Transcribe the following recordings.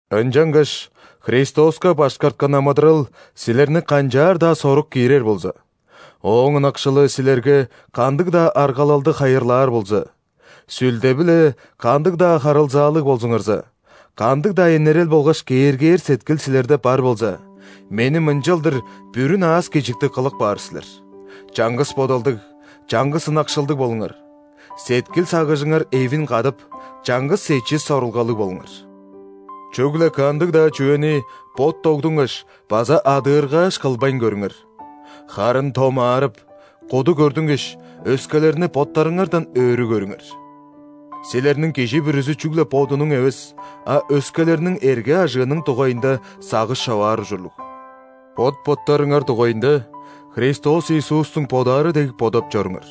Ынчангаш Христоска башкарткан амыдырал силерни канчаар-даа сорук киирер болза, Ооң ынакшылы силерге кандыг-даа аргалалды хайырлаар болза, Сүлде-биле кандыг-даа харылзаалыг болзуңарза, кандыг-даа энерел болгаш кээргээр сеткил силерде бар болза, мени мынчалдыр бүрүн аас-кежиктиг кылып каар силер: чаңгыс бодалдыг, чаңгыс ынакшылдыг болуңар, сеткил-сагыжыңар эвин кадып, чаңгыс эчис сорулгалыг болуңар. Чүгле кандыг-даа чүвени бот тогдунгаш база адыыргааш, кылбайн көрүңер. Харын томаарып, куду көрдүнгеш, өскелерни боттарыңардан өрү көрүңер. Силерниң кижи бүрүзү чүгле бодунуң эвес, а өскелерниң эрге-ажыының дугайында сагыш човаар ужурлуг. Бот-боттарыңар дугайында Христос Иисустуң бодаары дег бодап чоруңар.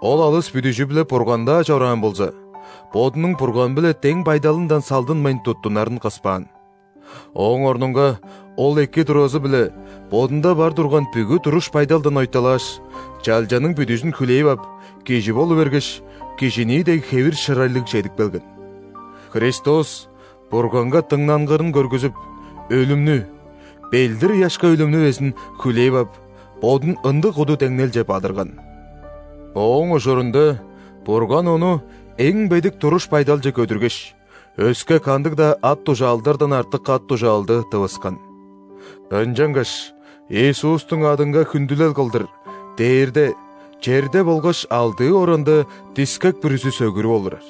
Ол алыс бүдүжү-биле Бурган-даа чораан болза,Бодунуң Бурган-биле дең байдалындан салдынмайн туттунарын кыспаан. Ооң орнунга Ол эки туразы-билеБодунда бар турган бүгү туруш-байдалдан ойталааш,чалчаның бүдүжүн хүлээп ап, кижи болу бергеш,кижинии дег хевир-шырайлыг чедип келген. Христос Бурганга дыңнангырын көргүзүп,өлүмнү, ·белдир-ыяшка өлүмнү безин, хүлээп ап,Бодун ындыг куду деңнелче бадырган! Ооң ужурунда Бурган Ону эң бедик туруш-байдалче көдүргеш,өске кандыг-даа ат-дужаалдардан артык ат-дужаалды тывыскан. Ынчангаш Иисустуң адынга хүндүлел кылдырдээрде, черде болгаш алдыы оранда дискек бүрүзү сөгүрүп олурар,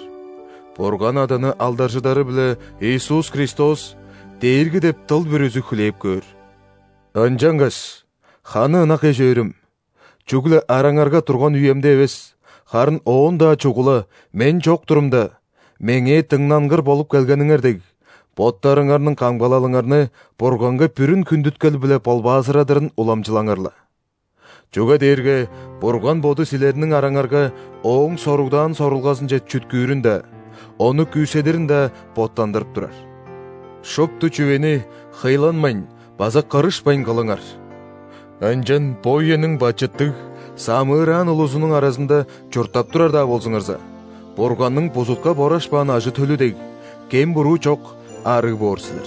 Бурган Аданы алдаржыдары-биле Иисус Христос – Дээрги депдыл бүрүзү хүлээп көөр. Ынчангаш, ханы ынак эш-өөрүм, чүгле араңарга турган үемде эвес, харын оон-даа чугула – мен чок турумда, меңээ дыңнангыр болуп келгениңер дег, боттарыңарның камгалалыңарны Бурганга бүрүн хүндүткел-биле болбаазырадырын уламчылаңар-ла. Чүге дээрге Бурган Боду силерниң араңарга Ооң соругдаан сорулгазынче чүткүүрүн-даа, ону күүседирин-даа боттандырып турар. Шупту чүвени хыйланмайн база кырышпайн кылыңар. Ынчан бо үениң бачыттыг, самыыраан улузунуң аразында чурттап турар-даа болзуңарза, Бурганның бузутка борашпаан ажы-төлү дег, кем-буруу чок, арыг боор силер.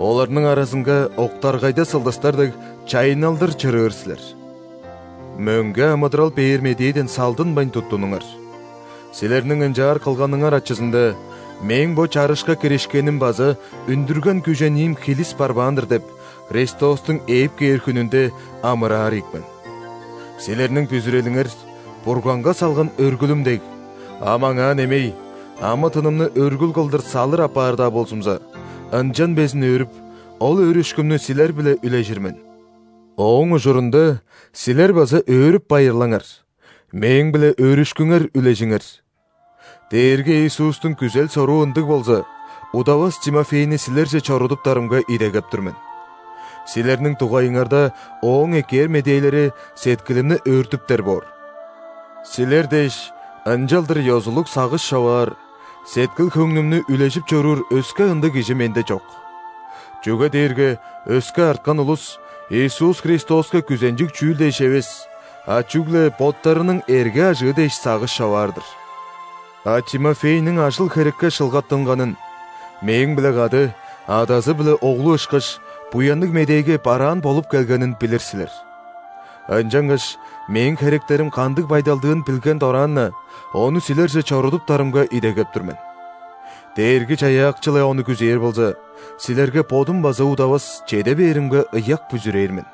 Оларның аразынга, октаргайда сылдыстар дег, чайынналдыр чырыыр силер. Мөңге амыдырал бээр медээден салдынмайн туттунуңар. Силерниң ынчаар кылганыңар ачызында, мээң бо чарышка киришкеним база үндүрген күжениим хилис барбаан-дыр деп, Христостуң ээп кээр хүнүнде амыраар ийик мен. Силерниң бүзүрелиңер – Бурганга салган өргүлүм дег; ам аңаа немей амы-тынымны өргүл кылдыр салыр апаар-даа болзумза, ынчан безин өөрүп, ол өөрүшкүмнү силер-биле үлежир мен. Ооң ужурунда силер база өөрүп-байырлаңар, мээң-биле өөрүшкүңер үлежиңер! Дээрги Иисустуң күзел-соруу ындыг болза, удавас Тимофейни силерже чорудуптарымга идегеп тур мен. Силерниң дугайыңарда ооң эккээр медээлери сеткилимни өөртүптер боор. Силер дээш, ынчалдыр ёзулуг сагыш човаар, сеткил-хөңнүмнү үлежип чоруур өске ындыг кижи менде чок. Чүге дээрге өске арткан улус Иисус Христоска күзенчиг чүүл дээш эвес, а чүгле боттарының эрге-ажыы дээш сагыш човаар-дыр. А Тимофейниң ажыл-херекке шылгаттынганын, мээң-биле кады, адазы биле оглу ышкаш, Буянныг Медээге бараан болуп келгенин билир силер. Ынчангаш, мээң херектерим кандыг байдалдыын билген дораан-на, ону силерже чорудуптарымга идегеп тур мен. Дээрги-Чаяакчы-ла ону күзээр болза, силерге бодум база удавас чеде бээримге ыяк бүзүрээр мен.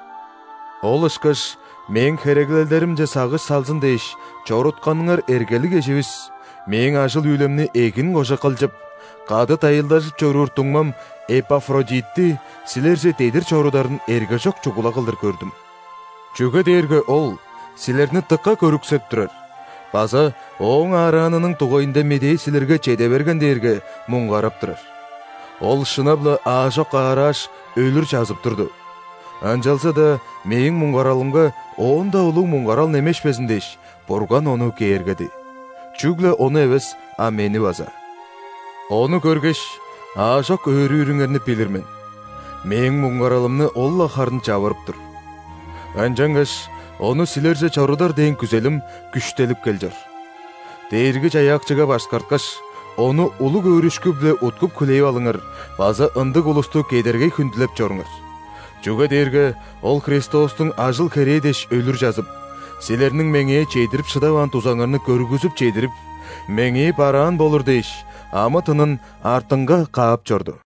Ол ышкаш мээң хереглелдеримче сагыш салзын дээш чорутканыңар эргелиг эживис, мээң ажыл-үүлемни эгин кожа кылчып, кады дайылдажып чоруур дуңмам Эпафродитти силерже дедир чорударын эргежок чугула кылдыр көрдүм. Чүге дээрге ол силерни дыка көрүксеп турар база ооң аараанының дугайында медээ силерге чеде берген дээрге, муңгарап турар. Ол, шынап-ла, аажок аарааш, өлүр чазып турду, ынчалза-даа мээң муңгаралымга оон-даа улуг муңгарал немешпезин дээш, Бурган ону кээргеди (чүгле ону эвес, а мени база). Ону көргеш, аажок өөрүүрүңерни билир мен, мээң муңгаралымны ол-ла харын чавырып тур. Ынчангаш ону силерже чорудар дээн күзелим күштелип кел чор. Дээрги-Чаяакчыга башкарткаш, ону улуг өөрүшкү-биле уткуп хүлээп алыңар база ындыг улусту кедергей хүндүлеп чоруңар. Чүге дээрге ол Христостуң ажыл-херээ дээш өлүр чазып, силерниң меңээ чедирип шыдаваан дузаңарны көргүзүп чедирип, меңээ бараан болур дээш, амы-тынын артынга каап чорду.